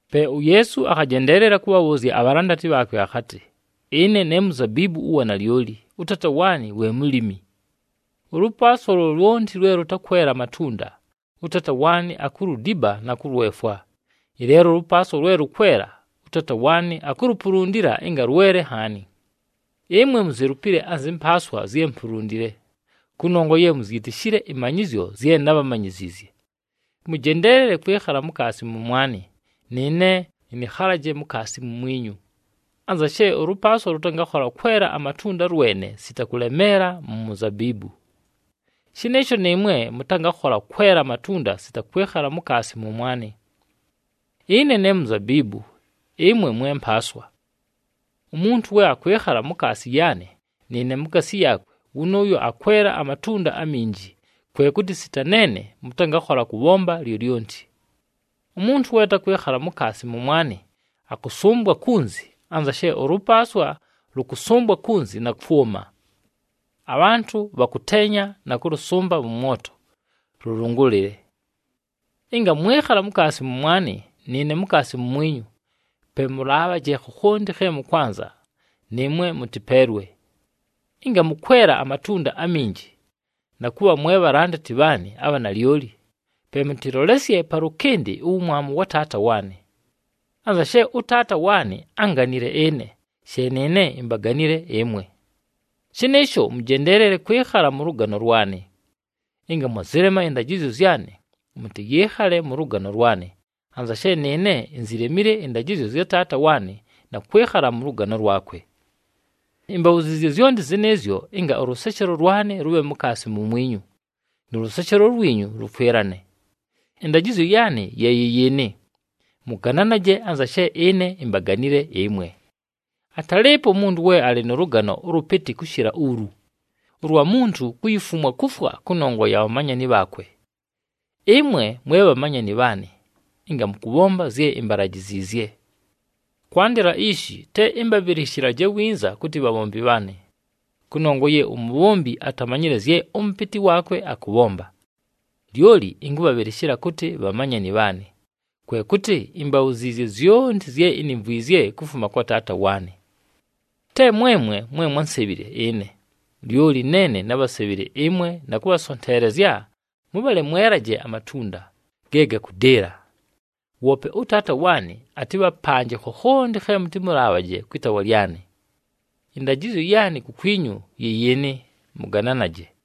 Pe uYeesu akhajendeelela kʉbhabhʉʉzya abhalandati bhaakwe akhatɨ, “Ɨne ne muzabiibu ʉwa nalyoli, ʉTaata waanɨ we mulimi. Ʉlʉpaaswa lyolyonti lwe lʉtakwela amatunda, ʉTaata waanɨ akuludiba na kʉlwefwa. Ɨleelo ʉlʉpaaswa lwe lʉkwela, ʉTaata waanɨ akulupulundila ɨnga lwele nhaani. Ɨmwe muzelupile anzɨ mpaaswa zye mpulundile, kʉnongwa ye muzyitishile ɨmanyɨzyo zye nábhamanyiziizye. Mʉjendeelele kwɨkhala mukaasi mʉmwanɨ, nɨɨne ɨnɨkhalaje mukaasi mumwinyu. Anza she ʉlʉpaaswa lʉtangakhola kwela amatunda lwene sita kʉlemeela mu muzabiibu, shɨnɨɨsho nɨɨmwe mʉtangakhola kwela amatunda sita kwɨkhala mukaasi mʉmwanɨ. “Ɨne ne muzabiibu, ɨmwe mwe mpaaswa. Umuntu we akwɨkhala mukaasi yaanɨ nɨɨne mukaasi yaakwe, wʉnʉʉyo akwela amatunda aminji, kwe kʉtɨ sita neene mʉtangakhola kʉbhomba lyolyonti. Umuntu we atakwɨkhala mukaasi mʉmwanɨ akʉsʉmbwa kunzi anza she ʉlʉpaaswa lʉkʉsʉmbwa kunzi na kwʉma. Abhantʉ bhakʉteenya na kʉlʉsʉmba mʉ mwoto lʉlʉngʉlɨle. Ɨnga mwɨkhala mukaasi mʉmwanɨ nɨɨne mukaasi mumwinyu, pe mʉlaabhaje khokhonti khe mʉkwanza nɨɨmwe mʉtɨpeelwe. Ɨnga mʉkwela amatunda aminji, na kʉbha mwe bhalandati bhaanɨ abha nalyoli, pe mʉtɨlolesye palʉkɨndɨ uwumwamu wa Taata waanɨ. Anza she ʉTaata waanɨ ánganile ɨne, she nɨɨne imbaganile ɨmwe. Shɨnɨɨsho, mʉjendeelele kwɨkhala mʉ lʉgano lwanɨ. Ɨnga mwazɨlema ɨndajɨzyo zyanɨ, mʉtɨyɨɨkhale mʉ lʉgano lwanɨ, anza she nɨɨne inzilemile ɨndajɨzyo zya Taata waanɨ na kwɨkhala mʉ lʉgano lwakwe. “Imbabhuziizye zyonti zɨnɨɨzyo ɨnga ʉlʉseshelo lwanɨ lʉbhe mukaasi mumwinyu, nʉ lʉseshelo lwinyu lʉkwɨlane. Ɨndajɨzyo yaanɨ ye yɨ yɨɨnɨ, ‘Mʉgananaje anza she ɨne imbaganile ɨmwe.’ Atalɨɨpo umuntu we alɨ nʉ lʉgano ʉlʉpɨtɨ kʉshɨla ulu, ʉlwa muntu kuyifumwa kufwa kʉnongwa ya bhamanyani bhaakwe. Ɨmwe mwe bhamanyani bhaanɨ ɨnga mʉkʉbhomba zye imbalajiziizye. Kwandɨla ishi te ɨmbabhɨlɨshɨlaje winza kʉtɨ bhabhombi bhaanɨ, kʉnongwa ye umubhombi atamanyile zye ʉmʉpɨtɨ waakwe akʉbhomba. Lyoli ɨnkʉbhabhɨlɨshɨla kʉtɨ bhamanyani bhaanɨ, kwe kʉtɨ imbabhuziizye zyonti zye inimvwizye kufuma kwa Taata waanɨ. Te mwemwe mwe mwánsebhile ɨne, lyoli neene nábhasebhile ɨmwe na kʉbhasonteelezya mʉbhale mwelaje amatunda, ge gakʉdɨɨla. Woope ʉTaata waanɨ atɨbhapanje khokhonti khe mʉtɨmʉlaabhaje kwɨ taawa lyanɨ. Ɨndajɨzyo yaanɨ kukwinyu yɨ yɨɨnɨ: mʉgananaje.”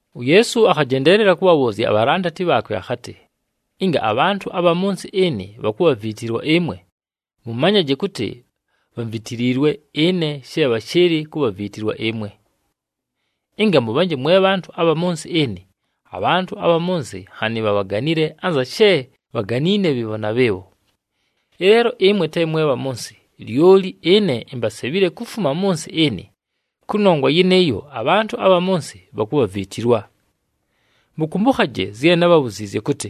UYeesu akhajendeelela kʉbhabhʉʉzya abhalandati bhaakwe akhatɨ, “Ɨnga abhantʉ abha mʉ nsɨ ɨnɨ bhakubhaviitilwa ɨmwe, mʉmanyaje kʉtɨ bhamvitiliilwe ɨne she bhashɨɨlɨ kubhaviitilwa ɨmwe. Ɨnga mʉbhanje mwe bhantʉ abha mʉ nsɨ ɨnɨ, abhantʉ abha mʉ nsɨ nhanɨ bhabhaganile anza she bhaganiine bhɨɨbho na bhɨɨbho. Ɨleelo ɨmwe te mwe bha mʉ nsɨ, lyoli ɨne imbasebhile kufuma mʉ nsɨ ɨnɨ, kʉnongwa yɨnɨɨyo, abhantʉ abha mʉ nsɨ bhakubhaviitilwa. Mʉkʉmbʉkhaje zye nábhabhuziizye kʉtɨ,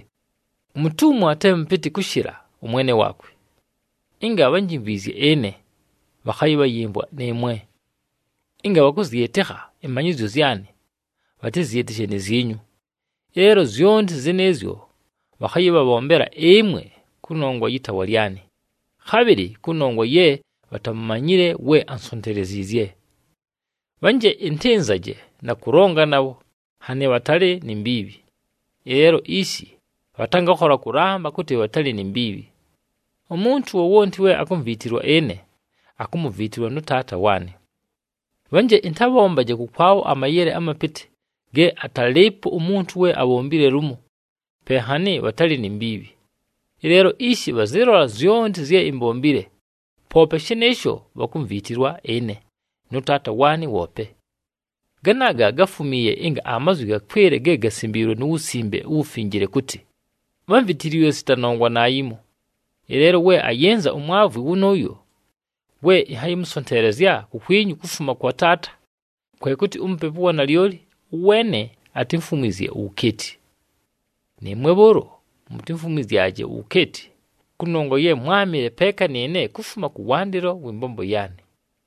‘Umutumwa te mʉpɨtɨ kʉshɨla ʉmwene waakwe.’ Ɨnga bhanjimvwizye ɨne, bhakhayɨbhayɨmvwa nɨɨmwe. Ɨnga bhakʉzyɨtɨkha ɨmanyɨzyo zyanɨ, bhatɨzyɨtɨshe ni zyinyu. Ɨleelo zyonti zɨnɨɨzyo bhakhayɨbhabhombela ɨmwe kʉnongwa yɨ taawa lyanɨ, khabhɨlɨ kʉnongwa ye bhatamumanyile we ansonteleziizye. Bhanje ɨntɨnzaje na kʉlonga nabho, nhanɨ bhatalɨ ni mbiibhi. Ɨleelo ishi bhatangakhola kʉlamba kʉtɨ bhatalɨ ni mbiibhi. Umuntu wowonti we akumviitilwa ɨne, akumuviitilwa nʉ Taata waanɨ. Bhanje ɨntabhombaje kʉkwabho amayele amapɨtɨ ge atalɨɨpo umuntu we abhombile lumo, pe nhanɨ bhatalɨ ni mbiibhi. Ɨleelo ishi bhazɨlola zyonti zye imbombile, poope shɨnɨɨsho bhakumviitilwa ɨne, nʉ Taata waanɨ woope. Ganaaga gafumiiye ɨnga amazwi gakwɨle ge gasimbiilwe mu Wusimbe uWufinjile kʉtɨ, ‘Bhamvitiliilwe sita nongwa naayimo.’ “Ɨleelo we ayɨnza uMwavwi wʉnʉʉyo we ɨnhayɨmʉsonteelezya kukwinyu kufuma kwa Taata kwe kʉtɨ uMupepu ʉwa nalyoli, ʉweene atimfumwizye uwukeeti. Nɨɨmwe bhʉʉlo mutimfumwizyaje uwukeeti, kʉnongwa ye mwámɨle peeka nɨɨne kufuma kʉwandɨlo wɨ mbombo yaanɨ.”